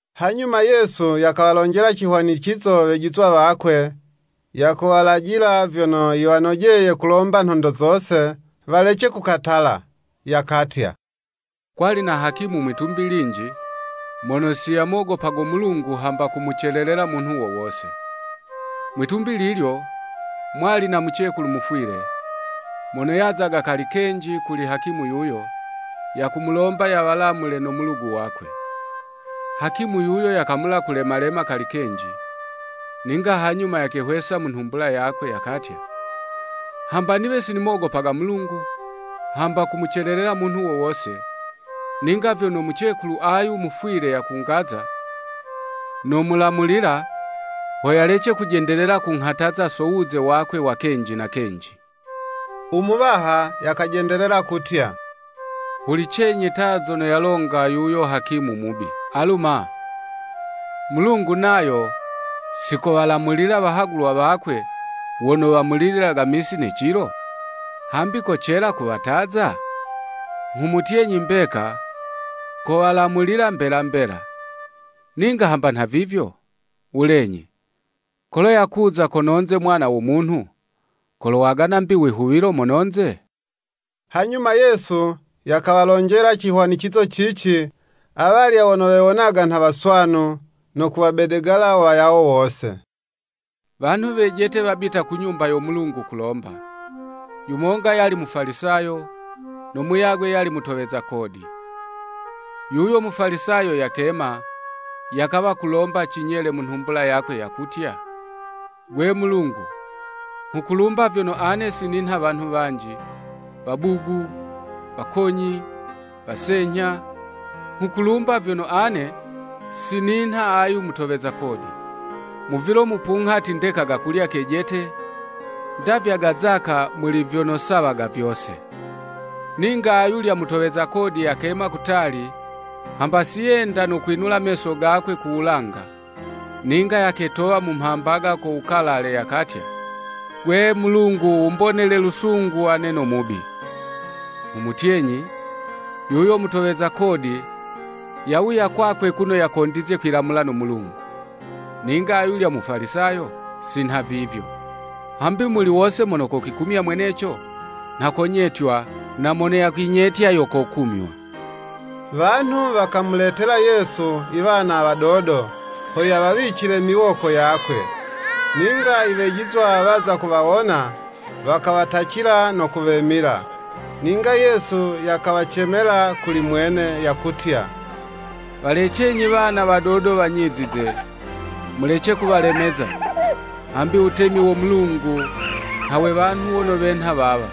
Hanyuma Yesu yakawalonjela cihwanicizo Wejizwa wakwe, yakuwalajila vyono yiwanojeye kulomba nhondo zose, walece kukatala. Yakatya, “Kwali na hakimu mwitumbi linji, mono si yamogopago Mulungu hamba kumucelelela munhu wo wose. Mwitumbi lilyo, mwali na mucekulu mufwile; mono yazaga kali kenji kuli hakimu yuyo, yakumulomba yawalamule no mulugu wakwe. Hakimu yuyo yakamula kulemalema kali kenji, ninga hanyuma yakehwesa mu nhumbula yakwe, yakatya, ‘Hamba niwe sinimogopaga Mulungu, hamba kumucelelela munhu wo wose, ninga vyono mucekulu ayu mufwile yakungaza, nomulamulila, ho yalece kujendelela kunghataza so wuze wakwe wa kenji na kenji.’” U Muwaha yakajendelela kutya, “Hulicenyi ta, zono yalonga yuyo hakimu mubi. Alu ma, Mulungu nayo, si kowalamulila wahagulwa wakwe wono wamulililaga misi ne cilo? Hambi kocela kuwataza? Nghumutyenyi, mbeka kowalamulila mbela mbela. Ninga hamba nhavivyo, wulenyi, kolo yakuza kono'nze Mwana wo Munhu, kolowagana 'mbi wihuwilo mono'nze?” Hanyuma Yesu yakawalonjela cihwanicizo cici, awalya wono wewonaga nha waswanu, no kuwabedegala wayawo wose. “Wanhu wejete wabita ku Nyumba yo Mulungu kulomba, yumonga yali Mufalisayo, no muyagwe yali mutoweza kodi.” Yuyo Mufalisayo yakema, yakawa kulomba cinyele mu nhumbula yakwe yakutya, “Gwe Mulungu, nghukulumba vyono ane si ninha wanhu wanji, wabugu, wakonyi, wasenyha, nghukulumba vyono ane si ninha ayu mutoweza kodi. Mu vilo mupunghati ndekaga kulya kejete, ndavyaga zaka, muli vyono sawaga vyose.” Ninga ayulya mutoweza kodi yakema kutali, hamba si yenda no kwinula meso gakwe ku wulanga, ninga yaketowa mu mhambaga ko wukalale, yakatya, “Gwe Mulungu wumbonele lusungu ane no mubi.” Nghumutyenyi, yuyo mutoweza kodi, yawuya kwakwe kuno yakondizye kwilamula no Mulungu. Ninga ayulya u Mufalisayo, si nhavivyo. Hambi muli wose mono yakwikumya mweneco, nha konyetywa na mono yakwinyetya yo kokumywa. Wanhu wakamuletela Yesu i wana wadodo, ho yawawicile miwoko yakwe. Ninga iwejizwa waza kuwawona, wakawatacila no kuwemila. Ninga Yesu yakawacemela kuli mwene, yakutya, “Walecenyi wana wadodo wanyizize, mulece kuwalemeza; hambi wutemi wo Mulungu, nha we wanhu wono wenha wawa.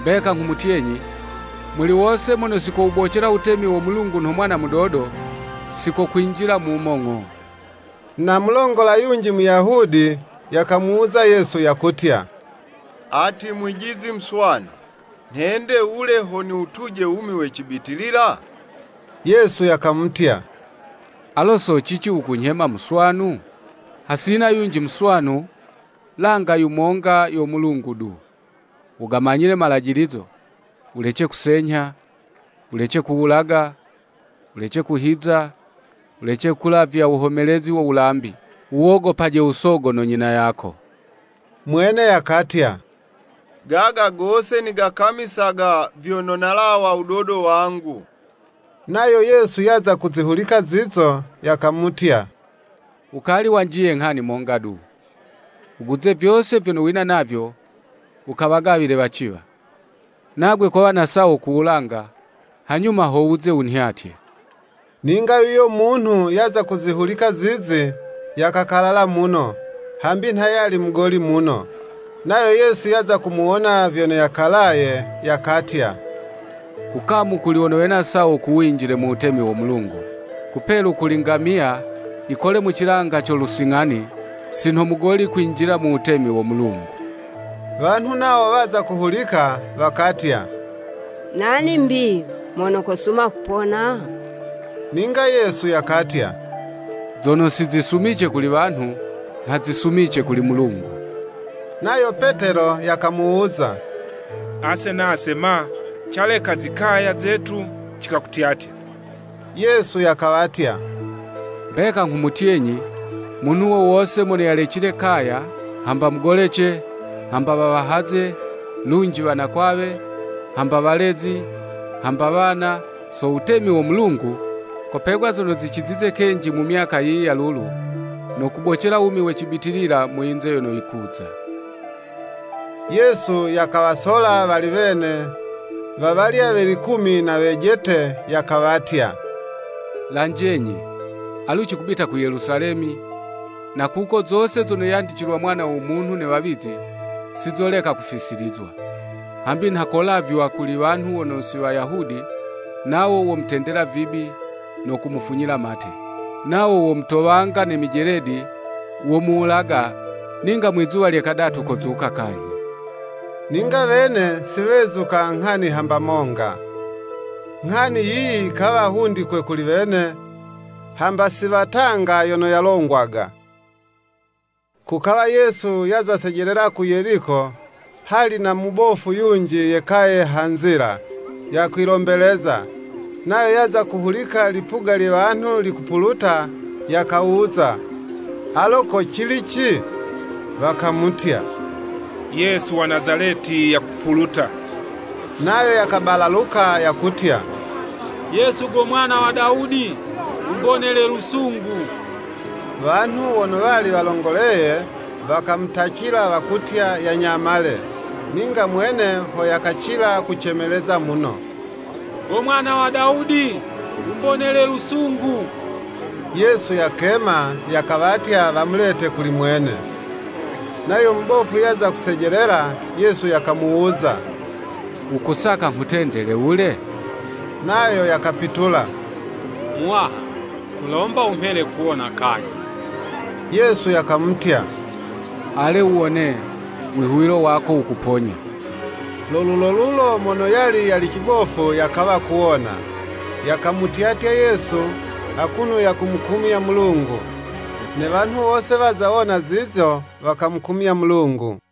Mbeka nghumutyenyi, muli wose mono si kowubocela wutemi wo Mulungu nho mwana mudodo, si kokwinjila mumo ng'o.” Na mulongola yunji, Muyahudi, yakamuwuza Yesu, yakutya, “Ati Mwijizi muswanu, nhende wule, ho niwutuje wumi we cibitilila?” Yesu yakamutya, “Alo so cici wukunyhema muswanu? Hasina yunji muswanu, langa yumonga, yo Mulungu du. Wugamanyile malajilizo, ‘Wulece kusenyha; Wulece kuwulaga; Wulece kuhiza; Wulece kulavya wuhomelezi wa wulambi. Wuwogopaje usogo no nyina yako.’” Mwene yakatya, “Gaga gose nigakamisaga, vyono nalawa wudodo wangu.” Nayo Yesu yaza kuzihulika zizo, yakamutya, “Wukali wanjiye nghani monga du; wuguze vyose vyono wina navyo, wukawagawile waciwa, nagwe kowa na sawo ku wulanga; hanyuma ho wuze wunhyatye.” Ninga yuyo munhu yaza kuzihulika zizi, yakakalala muno; hambi nha yali mugoli muno. Nayo Yesu yaza kumuwona vyono yakalaye, yakatya, “Kukamu kuli wono wena sawo ku winjile mu wutemi wo Mulungu! Kupelu kuli ngamiya yikole mu cilanga co lusing'ani, si nho mugoli kwinjila mu wutemi wo Mulungu.” Wanhu nawo waza kuhulika, wakatya, “Nani 'mbi mono kosuma kupona?” Ninga Yesu yakatya, “Zono si zisumice kuli wanhu, nha zisumice kuli Mulungu.” Nayo Petelo yakamuwuza, “Ase nase ma? Caleka zikaya zetu cikakutyatya.” Yesu yakawatya, “Mbeka nghumutyenyi, Munhu wo wose mono yalecile kaya, hamba mugolece, hamba wawahaze, lunji wanakwawe, hamba walezi, hamba wana, so wutemi wo Mulungu, kopegwa zono zicizize kenji mu myaka yiyi ya lulu, no kubocela wumi we cibitilila mu yinze yono yikuza.” Yesu yakawasola wali wene, wawalya we likumi na wejete, yakawatya, “Lanjenyi, alu cikubita ku Yelusalemi, na kuko zose zono yandicilwa Mwana wo Munhu ne wawizi, si zoleka kufisilizwa. Hambi nha kolavywa kuli wanhu wono si Wayahudi, nawo womutendela vibi, no kumufunyila mate. Nawo womutowanga ne mijeledi; womuwulaga, ninga mwizuwa lye kadatu kozuka kanyhi.” Ninga wene si wezuka nghani hamba monga, nghani yiyi yikawa hundikwe kuli wene, hamba si watanga yono yalongwaga. Kukawa Yesu yaza sejelela ku Yeliko, hali na mubofu yunji yekaye ha nzila, yakwilombeleza, nayo yaza kuhulika lipuga lye wanhu likupuluta, yakawuza, “Alo ko cilici?” Wakamutya, “Yesu wa Nazaleti yakupuluta.” Nayo yakabalaluka yakutya, “Yesu go mwana wa Dawudi wumbonele lusungu.” Wanhu wono wali walongoleye, wakamutacila wakutya yanyamale, ninga mwene ho yakacila kucemeleza muno, “Go mwana wa Dawudi wumbonele lusungu.” Yesu yakema, yakawatya wamulete kuli mwene. Nayo mubofu yaza kusejelela, Yesu yakamuwuza, “Wukusaka nghutendele wule?” Nayo yakapitula, “Muwaha, nghulomba wumhele kuwona kanyhi.” Yesu yakamutya, “Ale wuwone, Wihuwilo wako wukuponya.” Lo lulolulo mono yali yali cibofu yakawa kuwona, yakamutyatya Yesu, akuno yakumukumya Mulungu. Ne wanhu wose, waza wona zizo, wakamukumya Mulungu.